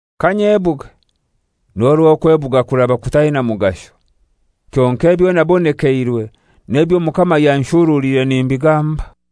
Kanyebuge, n'orwo okwebuga kuraba kutaina mugasho. Kyonkai ebyo nabonekeirwe n'ebyo Omukama yanshuruliire nimbigamba.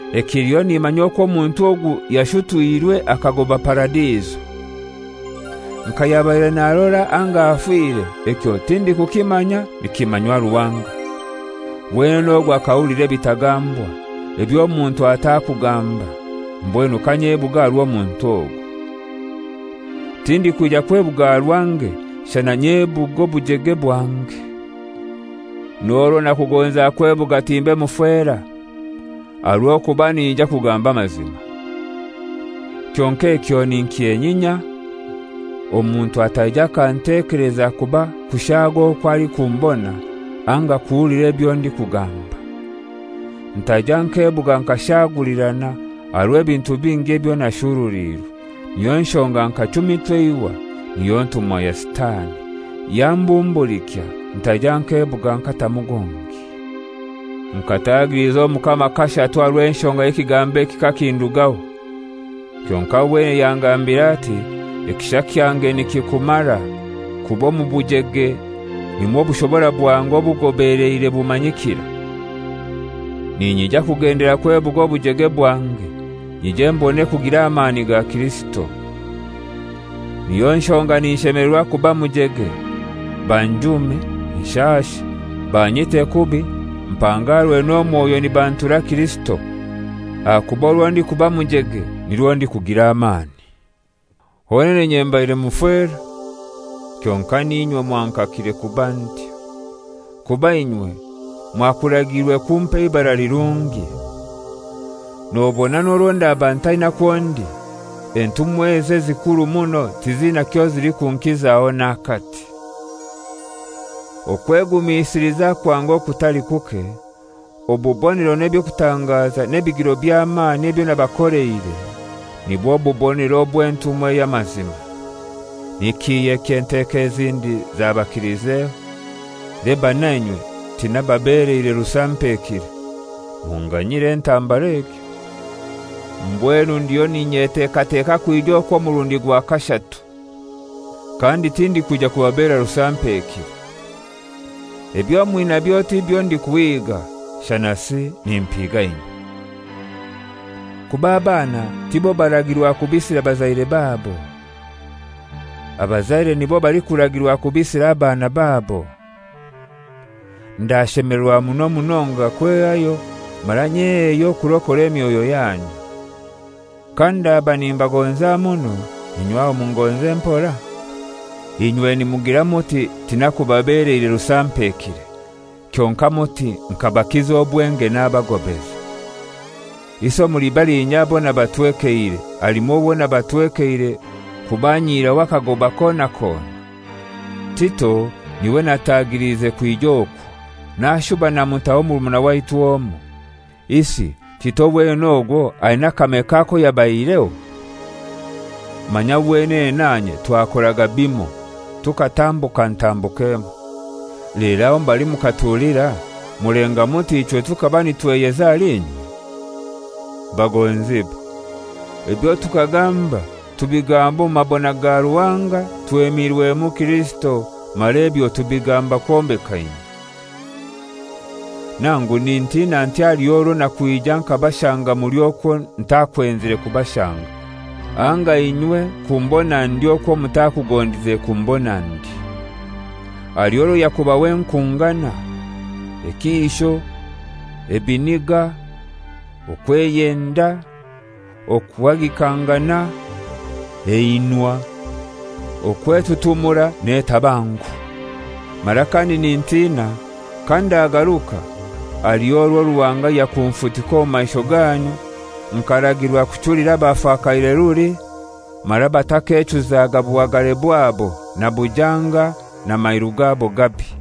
Ekiliho nimanya okwo omuntu ogu yashutwirwe akagoba Paradiso. Nka yabaire narora anga afire ekyo tindikukimanya, nikimanywa Ruhanga. Wenene ogwo akahulira ebitagambwa, eby'omuntu atakugamba. Mbwenu kanyebuge aha rw'omuntu ogu. Tindikwija kwebuga aha rwange shana nyebuge obujege bwange. N'orwo nakugonza kwebuga timbe mufera, aha rw'okuba ninyija kugamba amazima. Kyonkai ekyo ninkyenyinya, omuntu ataija akantekeleza kuba kushaaga okwo alikumbona anga kuhulira ebyo ndikugamba. Ntaija nkebuga nkashaagulirana aha rw'ebintu bingi ebyo nashuruliirwe, niyo nshonga nkachumitwa eihwa, niyo ntumwa ya Sitani, yambumbulikya, ntaija nkebuga nkatamu gungi. Nkatagiliza Omukama kashatu aha rw'enshonga y'ekigambo eki kakindugaho. Kyonkai wenene yangambira ati, «Ekisha kyange nikikumara, kuba omu bujege nimwo obushobora bwange obugobeleire bumanyikira.» Ninyija kugendelera kwebuga obujege bwange, nyije mbone kugira amani ga Kirisito. Niyo nshonga ninshemelerwa kuba mujege, banjume, nshashe, banyite kubi, mpangarwe n'omwoyo nibantura Kirisito. Ahakuba orwo ndikuba mujege nirwo ndikugira amani. Honene inye mbaire mufera! Kyonkai n'inywe mwankakire kuba ntyo, kuba inywe mwakuragiirwe kumpa eibara lirungi. Nobona n'orwo ndaba ntaina kwo ndi, entumwa ezo ezikuru muno tizina kyozilikunkizaho n'akati. Okwegumisiliza kwange okutali kuke, obubonero n'eby'okutangaza n'ebigiro by'amani ebyo nabakoleire nibwo bubonero obw'entumwa ey'amazima. Ni kihai eky'enteko ezindi zabakilizeho? Leba nainywe tinababeleire rusampekire. Munganyire entambara egyo! Mbwenu ndiyo n'inyetekateka kwija okwo omurundi gwa kashatu. Kandi tindikwija kubabera rusampekire. Ebyo mwinabyo tibyo ndikuhiga, shanasi nimpiga inywe. Kuba abaana tibo baragirwa kubisira bazaire babo; abazaire nibo balikuragirwa kubisira abana babo. Ndashemelerwa muno munonga kwehayo, mara nyeheyo kurokora emyoyo yanyu. Kandaba nimbagonza muno, inywe aho mungonze mpora? Inywe nimugira muti tinakubabeleire rusampekire, kyonkai muti nkabakiza obwenge nabagobeza. Isi omuli balinya abo nabatwekeire halimu owo nabatwekeire kubanyihiraho akagoba kona kona? Tito n'iwe natagiliize kwija okwo, nashuba namutaho murumuna waitu omoi. Isi Tito wenene ogwo aina akameka ako yabaihireho? Manya wenene nanye twakoraga bimoi! Tukatambuka ntambuka emoi. Lero aho mbali mukatulira mulenga muti ichwe tukaba nitweyeza ahali inywe? Bagonzibwa, ebyo tukagamba tubigamba omu mabona ga Ruhanga twemirwemu Kirisito, mara ebyo tubigamba kwombeka inywe. Nangu nintina nti haliho orwo nakwija nkabashanga muli okwo ntakwenzire kubashanga, anga inywe kumbona ndi okwo mutakugondize kumbona ndi: Haliho orwo yakubaho enkungana, ekiisho, ebiniga, okweyenda, okuhagikangana, einwa, okwetutumura n'etabangu. Mara kandi nintina kandagaruka haliho orwo Ruhanga yakunfutika omu maisho ganyu nkaragirwa kuchulira abafakaire ruli mara batakechuzaga buhagare bwabo, na bujanga, na mairu gabo gabi.